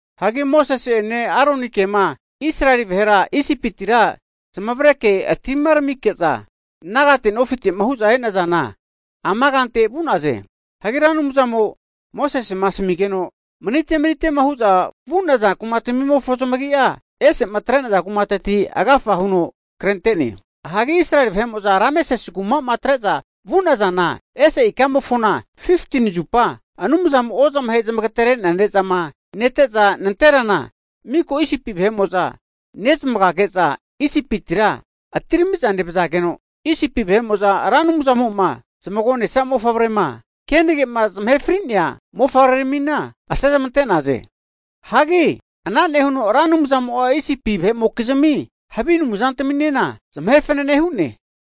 Hagi Mosese'ene Aronike'ma Israeli vahera Isipitira zamavare atimaramike'za nagate nofite'ma hu'za e'nazana ama kante vu'naze. Hagi Ra Anumzamo Mosesena asamigeno manite manite'ma hu'za vu'naza kumatamimofo zamagia ese'ma atre'naza kumateti agafa huno krente'ne. Hagi Israeli vahe'mo'za Rameses kumama atre'za vu'nazana ese ikamofona 15tini zupa Anumzamo ozamahe zamagatere'nea ne'zama nete'za nanterana, miko Isipi vahe'mo'za nezamagage'za Isipitira atiramiza nevazageno, Isipi vahe'mo'za Ra Anumzamo'ma zmagonesa mofavrema kenagema zamahe fri'nea mofavreramina asezmante'naze. Hagi ana nehuno Ra Anumzamo'a Isipi vahe'mokizmi havi anumzantaminena zamahe fanene hu'ne.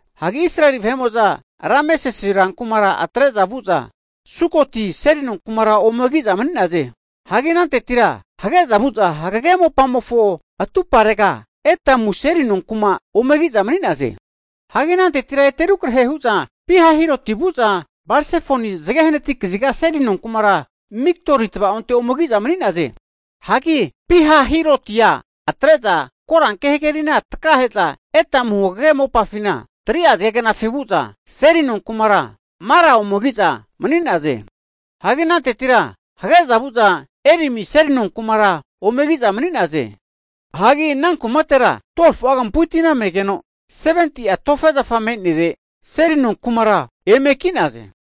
Hagi Israeli vahe'mo'za Rameses rankumara atre'za vu'za, Sukoti seli nonkumara ome ki'za mani'naze. Hagi anantetira hage'za vu'za hagege mopamofo atumparega Etamu seli nonkuma ome ki'za mani'naze. Hagi anantetira ete rukrahe' hu'za Pi-Hahirotia vu'za Bal-Sefonia zage hnati kaziga seli nonkumara Migdori tava'onte ome ki'za mani'naze. Hanki Pi-Hahirotia atre'za Koranke hagerina takahe'za, Etamu hagege mopafina 3'a zagegnafi vu'za, seli nonkumara Mara ome ki'za mani'naze. Hagi anantetira hage'za vu'za Elimi seli nonkumara ome ki'za mani'naze. Hagi ana kumatera 12fu'a kampu'i tina megeno 70'a tofe zafa me'nere seli nonkumara eme ki'naze.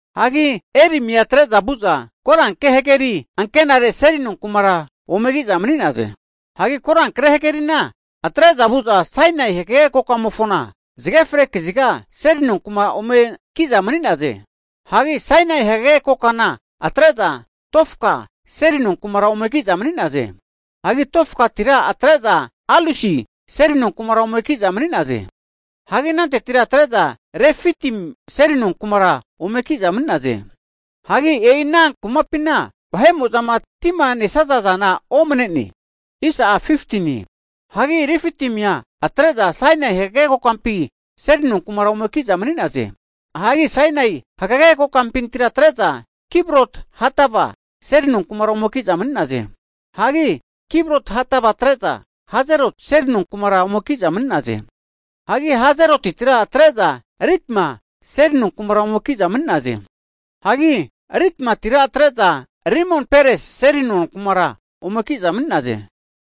Hagi Elimia atre'za vu'za Korankre hageri ankenare seli nonkumara ome ki'za mani'naze. Hagi korankre hagerina atre'za vu'za Sainai hagage kokamofona, zage ufre kaziga Seli nonkuma ome ki'za mani'naze. Hagi Sainai hagege kokana atre'za Dofka seli nonkumara ome ki'za mani'naze. Hagi Dofkatira atre'za Alusi seli nonkumara ome ki'za mani'naze Hagi anantetira atre'za Refitim seli nonkumara ome ki'za mani'naze. Hagi e'i ana kumapina vahe'mo'zama tima nesaza zana omane'ne. Hagi Refitimia atre'za Sainai hagage kokampi seli nonkumara ome ki'za mani'naze. Hagi Sainai hagege kokampintira atre'za, Kibrot-Hatava seli nonkumara ome ki'za mani'naze. Hagi Kibrot-Hatava atre'za Hazeroti seli kumara ome ki'za mani'naze. Hagi Hazerotitira atre'za Ritma seli nonkumara ome ki'naze. Hagi Ritmatira atre'za Rimon-Peresi seli nonkumara ome ki'za mani'naze.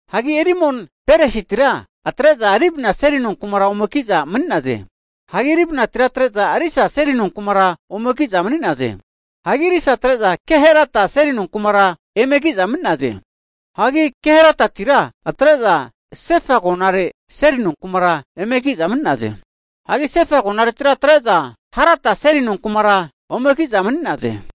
Hagi Rimon-Peresitira atre'za Libna seli nonkura ome ki'za mani'naze. Hagi Libnatira atre'za Risa seli nonkumara ome ki'za mani'naze. Hagi Risa atre'za Kehelata seli nonkumara eme ki'za mani'naze. Hagi Keheratitira atre'za Sefa agonare seli nonkumara eme ki'naze. Hagi Sefa agonaretira atre'za Harada seli nonkumara ome ki'za mani'naze.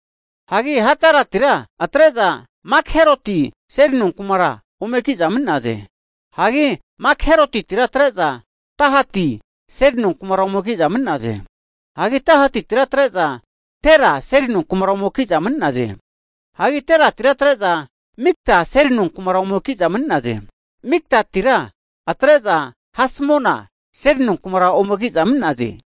Hagi Haradatira atre'za Makheloti seli nonkumara ome ki'za mani'naze. Hagi Makherotitira atre'za Tahati seli nonkumara ome ki'za mani'naze. Hagi Tahatitira atre'za Tera seli nonkumara ome ki'za mani'naze. Hagi Teratitira atre'za Mitka seli nonkumara ome ki'za mani'naze Hagi Mitkatira atre'za Hasmona seli nonkumara ome ki'za mani'naze.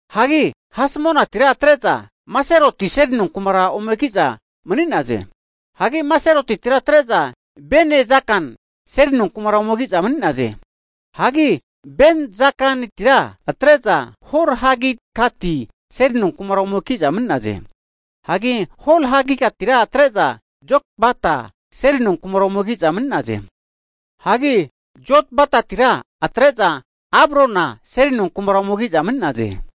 Hagi Hasmonatira atre'za Moseroti seli nonkumara ome ki'za mani'naze. Hagi Moserotitira atre'za Bene-Zakan seli nonkumara ome ki'za mani'naze. Hagi Bene-Zakanitira atre'za Hor-Hagidgati seli nonkumara ome ki'za mani'naze. Hagi Hor-Hagidgatira atre'za Jotbata seli nonkumara ome ki'za mani'naze. Hagi Zotbatatira atre'za Abrona seli nonkumara ome ki'za mani'naze.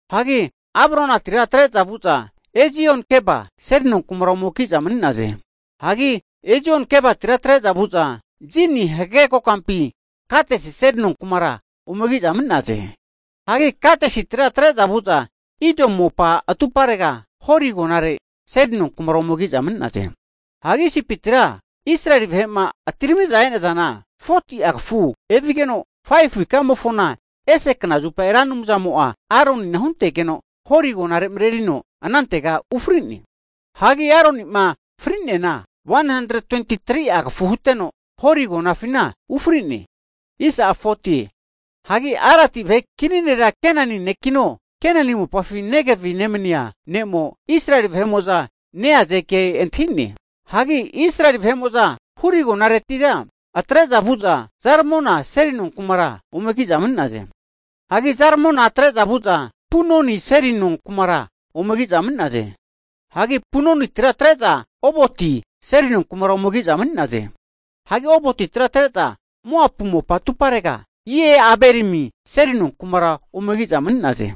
Hagi Abronatira atre'za vu'za Ezion-Geba seli nonkumara ome ki'za mani'naze. Hagi Ezion-Gebatira atre'za vu'za Zini hagege kokampi Kadesi seli nonkumara ome ki'za mani'naze. Hagi Kadesitira atre'za vu'za, Edomu mopa atuparega Hori agonare seli nonkumara ome ki'za mani'naze. Hagi Isipitima Israeli vahe'ma atiramiza e'nazaza, 40'a kafu evigeno 5fu ikamofona ese knazupa Ra Anumzamo'a Aronina huntegeno Hori agonare marerino anantega ufri'ne. Hagi Aronima fri'neana 123'a kafu huteno, Hori agonafina ufri'ne. Hagi Aradi vahe kini nera Kenani ne'kino Kenani mopafi Negevi nemania ne'mo Israeli vahe'mo'za neaze kea antahi'ne. Hagi Israeli vahe'mo'za Hori agonaretira atre'za vu'za Zalmona seli nonkumara ome ki'za mani'naze. Hagi Zalmona atre'za vu'za Punoni seli nonkumara ome ki'za mani'naze. Hagi Punonitira atre'za Oboti seli nonkumara ome ki'za mani'naze. Hagi Obotira atre'za Moapu mopa atuparega Ie-Abarimi seli nonkumara ome ki'za mani'naze.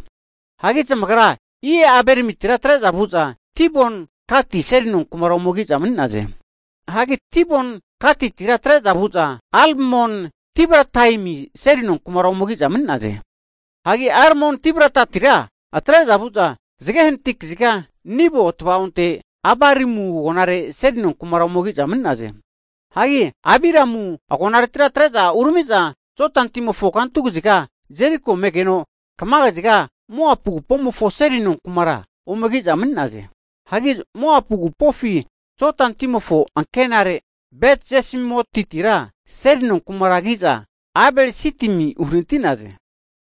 Hagi zamagra Ie-Abarimitira atre'za vu'za Dibon-Gati seli nonkumara ome ki'za mani'naze. Hagi Dibon-Gatitira atre'za vu'za Almon-Diblataimi seli nonkumara ome ki'za mani'naze. Hagi Almon-Diblataimitira atre'za vu'za zage hanati kaziga Nebo tava'onte Abarimu agonare seli nonkumara ome ki'za mani'naze. Hagi Abiramu agonaretira atre'za urami'za Jodani timofo kantu kaziga Jeriko megeno kama kaziga Moapu agupofi seli nonkumara ome ki'za mani'naze. Hagi Moapu agupofi Jodani timofo akenare Bet-Jeshimotitira seli nonkumara ki'za Abel-Sitimi uhanati'naze.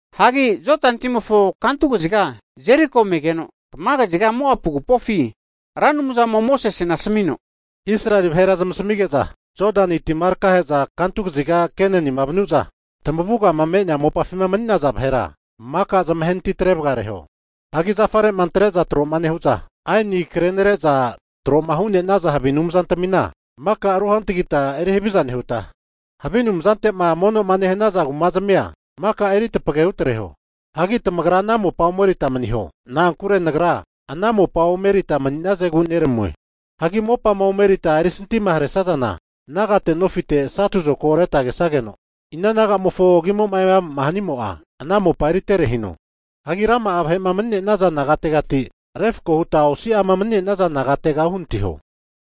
Hagi Jodani timofo kantu kaziga Jeriko megeno, kama kaziga Moapu agupofi Ra Anumzamo'a Mosesena asamino, Israeli vahera zamasamige'za Jodani tima takahe'za kantu kazigama Kenani vanu'za, tamavugama me'nea mopafima mani'naza vahera maka zamahenati trevareho. Hagi zafare'ma antre'za tro'ma nehu'za, aeni krenare'za tro'ma hu'nenaza havi anumzantamina maka ruhantagita eri haviza nehuta, havi anumzante'ma mono'ma nehanaza kumazamia maka eri tapage hutreho. Hagi tamagra ana mopa omerita maniho. Na'ankure Nagra ana mopa erita mani'nazegu neramue. Hagi mopama refkoma huta erisanti haresazana, nagate nofite satu zokago reta kesageno, ina nagamofo agimo'ma eama'ma hanimo'a ana mopa eritere hino. Hagi rama'a vahe'ma mani'nenaza nagategati refako huta osi'ama mani'nenaza negate uhanatiho.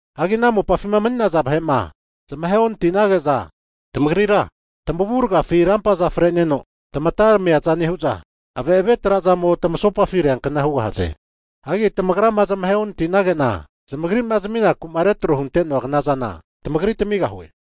Hagi ana mopafima mani'naza vahe'ma zamahe onati'nage'za tamagrira tamavurgafi rampaza fre'neno tamata tamiaza nehu'za, ave'ave trazamo tamasopafi reankna hugahaze. Hagi tamagrama zamahe onatinage'na zamagrima zaminaku'ma retro hunte'noa knazana tamagri tamigahue.